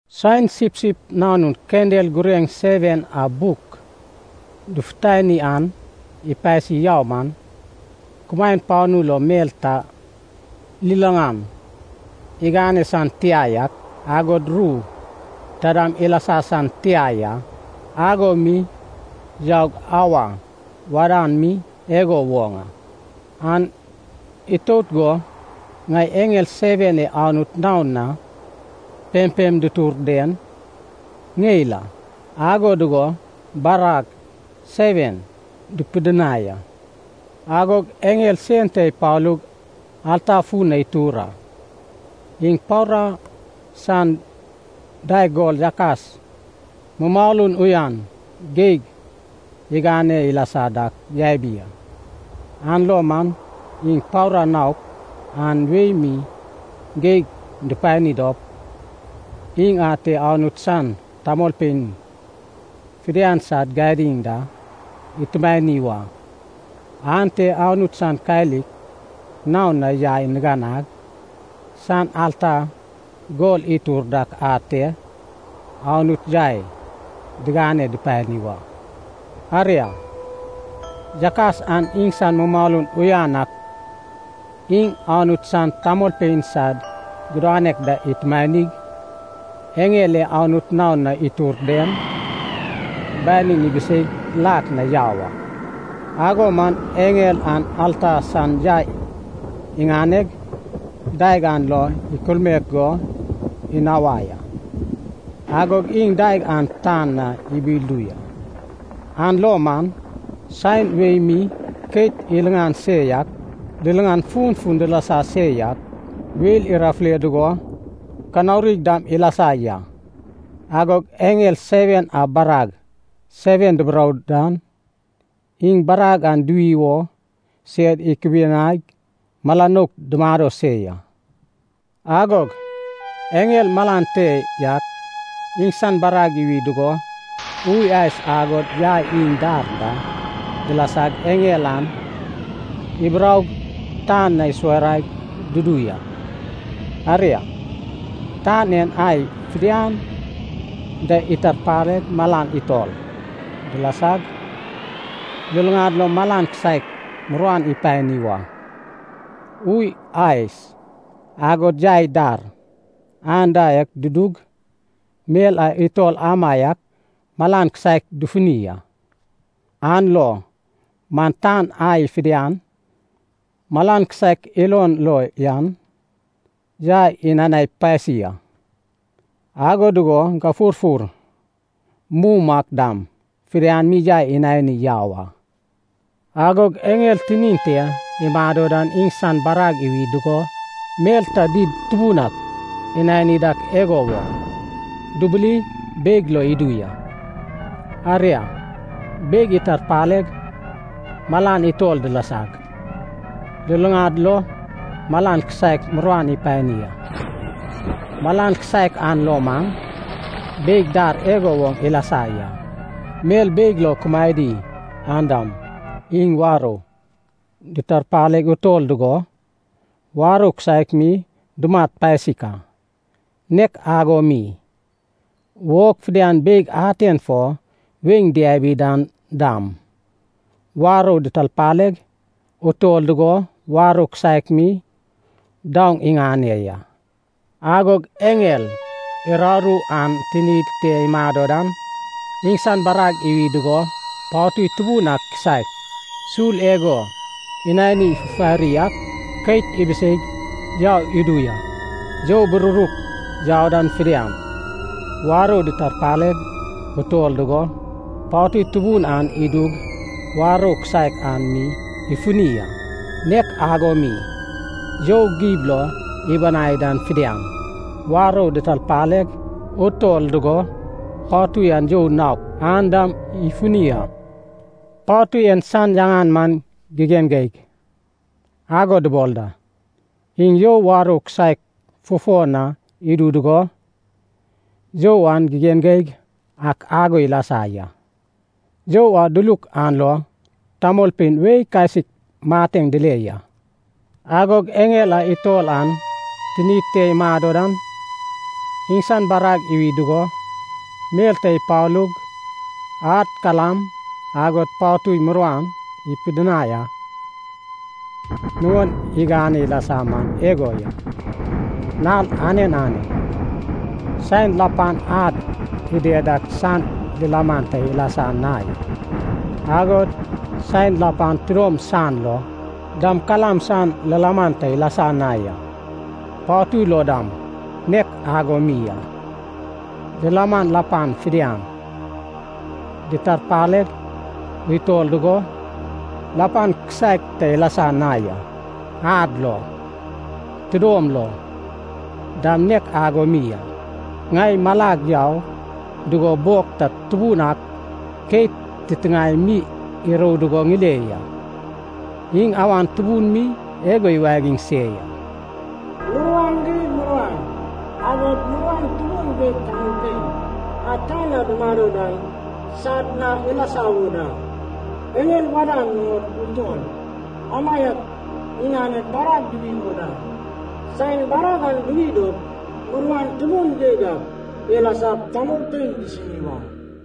Saen Sipsip Nanun kendel gureŋ seven a buk dufutani an ipasi yau man, kumaen panu lo mel ta liliŋan igane san tia yak, agod ru taidam ilasa san tia ya. Ago mi yaug auwa wadan mi igo woŋ a. An itout go ŋai eŋel seven e Anut naon na pempem dutur den ŋeil a, ago dugo barag seven dupidinai a. Agog eŋel sen ta ipalug alta fun na itur a. Iŋ paura san daeg gol yakas mumalun uyan geig igane ilasa dak yabi a. An lo man iŋ paura naok an wei mi geig dupani dop, iŋ ate Anut san tamolpein fidian sad gadiŋ da itumani wa. Ante Anut san kalik naon na yai niganag san alta gol itur dak ate Anut yai digane dupani wa. Aria, yakas an iŋsan mumalun uyan ak iŋ Anut san tamolpein sad gudanek da itumanig, eŋel e Anut naon na itur den, banin ibiseig lak na yau a. Ago man eŋel an alta san yai iŋaneg, daeg an lo ikulmaek go inawai a. Agog iŋ daeg an tan na ibildu ya. An lo man, saen wei mi keit iliŋan se yak, liliŋan funfun dilasa se yak, weil irafule dugo kanaurig dam ilasa ya. Agog eŋel seven a barag seven duburou dan, iŋ barag an duwi wo sed ikubianaig mala nouk dumado se ya. Agog eŋel malan te yak iŋsan barag iwi dugo ui ais agod yai iŋ dar da dilasag eŋel an iburoug tan na isuwaraig dudu ya. Aria, tan en ai fidian da itarpaleg malan utol dilasag, luluŋad lo malan kisaek muruan ipani wa. Ui ais agod yai dar anda dudug mel a utol amaiak malan kisaek dufuni a. An lo man tan ai fidian malan kisaek ilon lo yan yai inanai pasi a. Ago dugo gafurfur mum ak dam fidian mi yai inani yau a. Agog eŋel tinin te imado dan iŋsan barag iwi dugo, mel ta did tubun ak inani dak igo woŋ, dubuli beig lo idu ya. Aria, beig itarpaleg malan utol dilasag, luluŋad lo malan kisaek muruan ipani a. Malan kisaek an lo man, beig dar igo woŋ ilasa ya. Mel beig lo kumaedi an dam, iŋ warou ditarpaleg utol dugo, warou kisaek mi dumat pasik a. Nek ago mi, wog fidian beig aten fo weiŋ diabi dan dam, warou ditarpaleg utol dugo warou kisaek mi daoŋ iŋane ya. Agog eŋel uraru an tinid te imado dan, iŋsan barag iwi dugo patui tubun ak kisaek, sul igo inani fufari ak, keit ibiseig yau idu ya. You bururuk yau dan fidian, warou ditarpaleg utol dugo, patui tubun an idug warou kisaek an mi ifuni a, nek ago mi, you gib lo ibanai dan fidian, warou ditarpaleg utol dugo, patui an you naok an dam ifuni a. Patui en san yaŋan man “Gigen Geig” ago dubol da. Iŋ you warou kisaek fufo na idu dugo, you an gigen geig ak ago ilasa ya. You a duluk an lo tamolpein wei kasik mateŋ dile ya. Agog eŋel a utol an tinid te imado dan, iŋsan barag iwi dugo, mel ta ipalug, ad, kalam agod patui muruan ipidinai a. Nuŋon igane ilasa man igo ya. Nal anen anen, saen lapan ad ided dak san lilaman ta ilasa na ya, agod saen lapan tidom san lo dam kalam san lilaman ta ilasa na ya. Patui lo dam nek ago mi a. Lilaman lapan fidian ditarpaleg utol dugo, lapan kisaek ta ilasa na ya, ad lo, tidom lo dam nek ago mi a. Ŋai malag yau dugo bog ta tubun ak keit titiŋae mi irou dugo ŋile ya. Iŋ awan tubun mi igo iwagiŋ se ya, “Muruan di muruan agod muruan tubun geig tamolpein a tan na dumado dan sad na ilasa wo da. Eŋel wadan nuŋod utol amaiak iŋaned barag duwi wo da, saen barag an duwi dop muruan tubun geig ak ilasap tamolpein disini wa.”